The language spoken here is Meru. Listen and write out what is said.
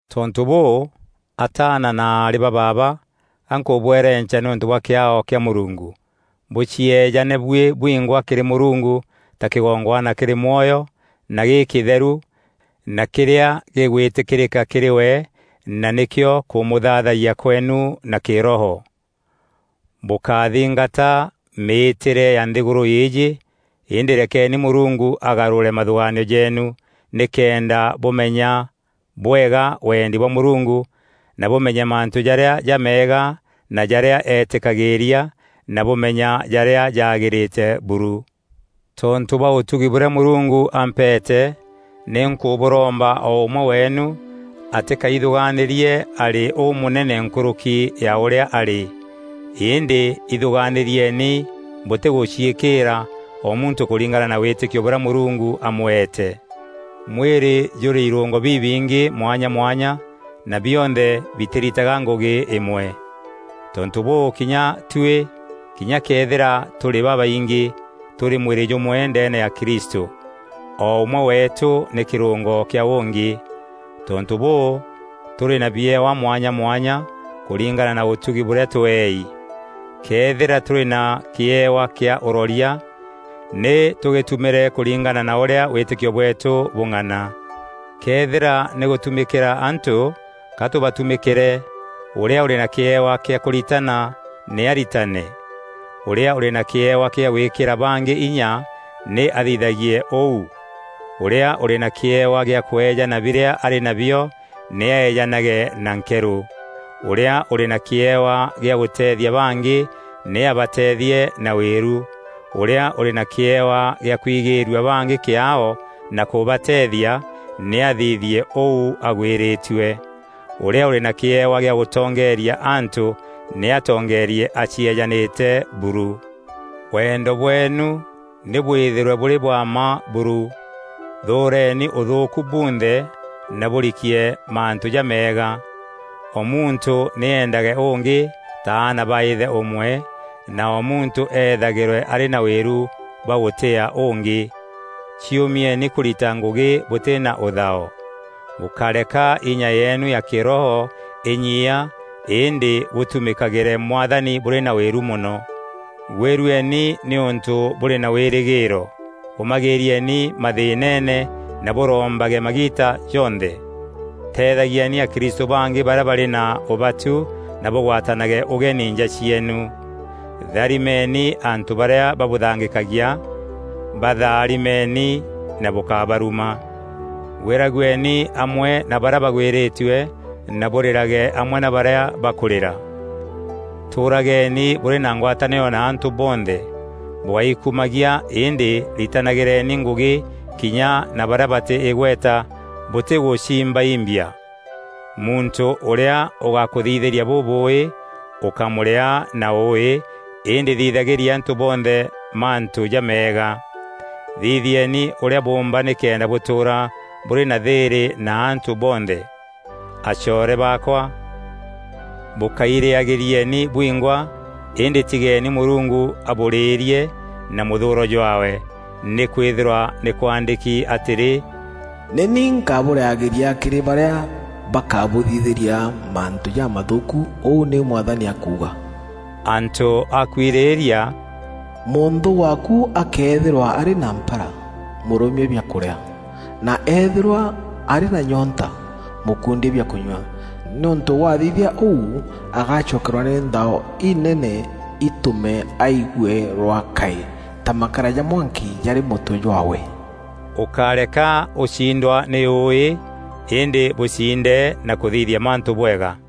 Tontû bûû, ataana na aarî ba baaba ga nkûbwerenca nîûntû bwa kîaao kîa Mûrungu, bûcieejane buî bwingwa kîrî Mûrungu ta kîgongwana kîrî mwoyo, na gîkîtheru na kîrîa gîgwîtîkîrîka kîrî we, na nîkîo kûmûthaathayia kweenu na kîroho. Bûkáthingata mîîtîre ya nthîgûrû îîjî, îndî rekeni Mûrungu agarûre mathûgaanio jeenu nîkenda bûmenya bwega wendi bwa Mûrungu, na bûmenye mantû jarîa jameega na jarîa eetîkagîîria na bûmenya jarîa jaagîrîte buru. Tontû bwa ûtugi bûrîa Mûrungu ampeete, nî nkûbûromba o ûmwe weenu, atîkaithûgaanîrie arî ûmûnene nkûrûki ya ûrîa arî. Îndî îthûgaanîrieni bûtîgûciîkîîra, o muntû kûringana na wîtîkio bûrîa Mûrungu amweete. Mwîrî jûrî irûngo bibingî mwanya mwanya na bionthe bitîritaga ngûgî îmwe. Tontû bûû, kinya tuî, kinya këethîra tûrî babaingî, tûrî mwîrî jûmwe ndeene ya Kristû. O ûmwe weetû nî kîrûngo kîa ûngî. Tontû bûû, tûrî na biewa mwanya mwanya, kûringana na ûtugi bûrîa tweei. Këethîra tûrî na kîewa kîa ûroria, nî tûgîtumîre kûringana na ûrîa wîtîkio bweetû bûng'ana. Këethîra nî gûtumîkîra antû, ka tûbatumîkîre; ûrîa ûrî na kîewa kîa kûritana nî aritane. Ûrîa ûrî na kîewa kîa gwîkîra bangî inya, nî athithagie ûu. Ûrîa ûrî na kîewa gîa kweejana birîa arî nabio, nî aeejanage na nkerû. Ûrîa ûrî na kîewa gîa gûteethia bangî, nî abateethie na wîru. Ûrîa ûrî na kîewa gîa kwigîîrua bangî kîaao na kûbateethia, nî athithie ûu agwîrîtue. Ûrîa ûrî na kîewa gîa gûtongeeria antû, nî atongeerie acieejanîte buru. Wendo bweenu nî bwîthîrwe bûrî bwa mma buru. Thûûreni ûthûûku bunthe na bûrikie mantû jameega. O muntû nî eendage ûngî ta aana ba îthe ûmwe, na o muntû eethagîrwe arî na wîru bwa gûtîîa ûngî. Ciûmieni kûrita ngûgî bûtî na ûthao. Bûkáreka inya yeenu ya kîroho înyiia îndî bûtumîkagîre Mwathani bûrî na wîru mono. Gwîrueni nîûntû bûrî na wîrîgîîro, ûmagîîrieni mathîînene, na bûrombage magiita jonthe. Teethagieni akristû bangî barîa barî na ûbatu na bûgwatanage ûgeni nja cieenu. Tharimeni antû barîa babûthangîkagia; batharimeeni na bûkábaruma. Gwîragueni amwe na barîa bagwîrîtue na bûrîrage amwe na barîa bakûrîra. Tûrageeni bûrî na ngwatanîro na antû bonthe; bûgáikumagia îndî ritanagîreni ngûgî kinya na barîa batî îgweta bûtîgûciimbaimbia. Muntû ûrîa ûgakûthithîria bûbûûî ûkámûrîaa na ûûî îndî thithagîria antû bonthe mantû jameega. Thithieni ûrîa bûûmba nîkenda bûtûûra bûrî na thîîrî na antû bonthe. Acoore baakwa, bûkáirîagîrieni bwingwa îndî tigeeni Mûrungu abûrîîrie na mûthûûro jwaawe; nîkwîthîrwa nî kwaandîki atîrî, “Nî ni nkabûrîagîria kîrî barîa bakabûthithîria mantû jamathûûku, ûu nîu Mwathani akuuga.” Antû a kwirîîria, “Mûnthû waaku akëethîrwa arî na mpara, mûrûmie biakûrîa; na eethîrwa arî na nyoonta, mûkundie bia kûnyua; nîûntû wathithia ûu agacokerwa nî nthao inene itûme aigue rwakaî ta makara ja mwanki jarî mûtwe jwaawe.” Ûkáreka ûcindwa nî ûûî, îndî bûciinde na kûthithia mantû bwega.